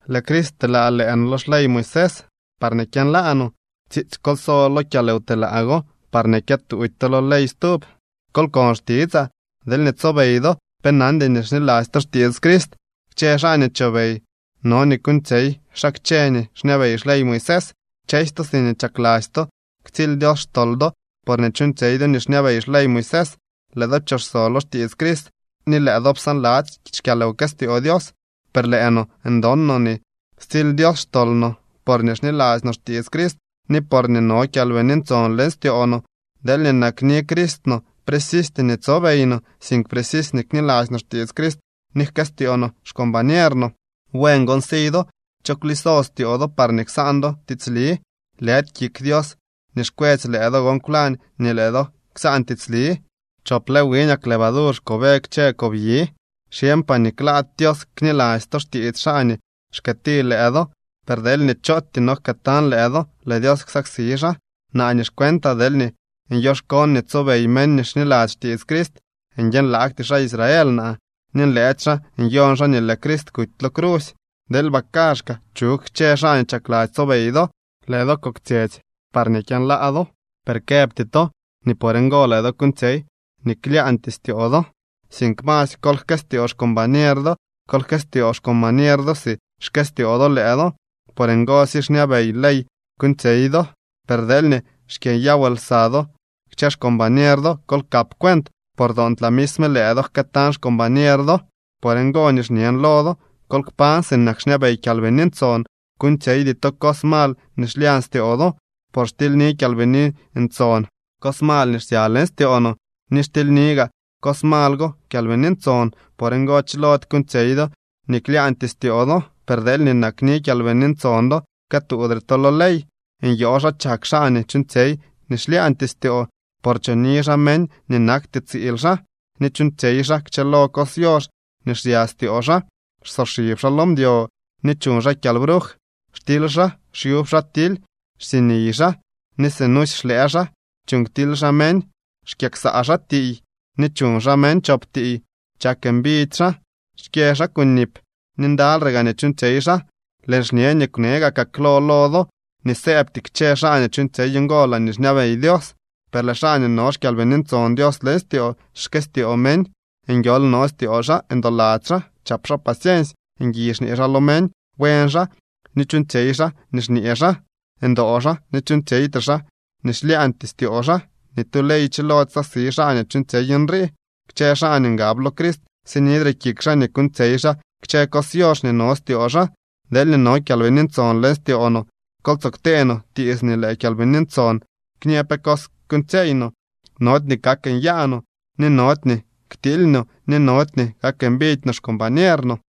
Lëë Crist pteelaa lëë no lo xley Moisés parñee kyënlaa no. Tsiitsy kol so kyalwtelaa go parñee kyëtuudy to lo ley stub. Kol kon xtitsaa. Deelñee tsobey do, pe nandy nii xniladzy to xtiits Crist. Kchë xaa nii chobey no nii kuuñtsyey xaa kchë nii xñabey xley Moisés. Kchësy to siñee chakladzy to ktsily Dios xtol do porñee chuuñtsyey do nii xñabey xley Moisés, lëë do pchoso lo xtiits Crist ni lëë do psaanladzy xkyalwkëstyoo Dios. Per lëë no ndon no nii stsily Dios xtol no porñee xniladzy no xtiits Crist ni porñee no Kyalbini Ntson leñ styoo no. Deelñee nakni Crist no, precisty nii tsobey no, sink precisy nii kniladzy no xtiits Crist ni jkëstyoo no xcombañer no. Buen gon si do. ¿Cho kwliso styoo do parñee ksaan do tiitsli? Lëdy kik Dios nii xkwetsy lëë do gon kwlañ nii lëë do ksaan tiitsli. “Chop lë wiñak levadur xkobe kchë kob yi.” Xyeñpaa nii klaady Dios kniladzy to xtiits xaa nii xkëëti lëë do, per deelñee chootyee no jkëëtañ lëë do, lëë Dios ksaksi xaa. Naa nii xcuentaa, deelñee bii nyoxkoon nii tsobey meñ nii xniladzy xtiits Crist, nguiënlaagty xaa Israel naa, ni nlëëdy xaa nyon xaa nii lëë Crist kuty lo crusy. ¡Deelba kaazhkaa chug kchë xaa nii chakladzy tsobey do! Lëë do koktsyetsy parñee kyënlaa do, per këbty to nii por ngo lëë do kuuñtsyey nii klyaañtyee styoo do, sink masy kol jkëstyoo xcombañer do. Kol jkëstyoo xcombañer do si xkëstyoo do lëë do, por ngosy xñabey ley kuuñtsyey do. Per deelñee xkyënyaw lsa do kchë xcombañer do, kol kap cuent, por toontlaa misme lëë do jkëëtañ xcombañer do. Por ngo nii xñen lo do: Kol kpañ sinak xñabey Kyalbini Ntson. Kuuñtsyeydy to cos mal nii xlyañ styoo do. Por xtilyni Kyalbini Ntson cos mal nii xsya leñ styoo no ni xtilyni gaa cos mal go Kyalbini Ntson. Por ngo chilody kuuñtsyey do nii klaañtyee styoo do. Per deelñee nakni Kyalbini Ntson do, këtuudre to lo ley. Nyoo xa chak xaa nii chuuñtsyey nii xlyaañtyee styoo, por choni xaa meñ nii nakty tsiil xaa, ni chuuñtsyey xaa kchëlo cos yox nii xsya styoo xaa, xsoxib xaa lo mdyo ni chuñ xaa kyalbruj. Xtily xaa, xyub xaa tily, xsiiniy xaa, ni sinusy xlëë xaa. Chuuñ ktily xaa meñ, xkyëksaa xaa tiiy, ni chuñ xaa meñ chop tiiy. Chak mbidy xaa, xkyë xaa kunip, ni ndalyre gaa nii chuuñtsyey xaa. Lëën xñe nii kwne gakaa klo lo do, nii sëëbty kchë xaa nii chuuñtsyey ngo laañee xñabey Dios. Per lëë xaa nii no xKyalbini Ntson Dios leñ styoo xkyëstyoo meñ, nguiool no styoo xaa, ndoladzy xaa, chap xaa paciensy, ngui xñee xaa lo meñ, buen xaa, ni chuuñtsyey xaa nii xñee xaa. Ndoo xaa ni chuuñtsyeytre xaa nii xlyaañtyee styoo xaa. Ni tu ley chilody ksaksi xaa nii chuuñtsyey nrii. Kchë xaa nii ngab lo Crist sinidre kik xaa nii kuuñtsyey xaa kchë cos yox nii no styoo xaa. Deelñee no Kyalbini Ntson leñ styoo no, kol tsoo ktee no tiits nii lëë Kyalbini Ntson kñë pe cos kuuñtsyeey no. Nody nii kak nyaa no, ni nody nii ktiily no, ni nody nii kak mbidy no xcombañer no.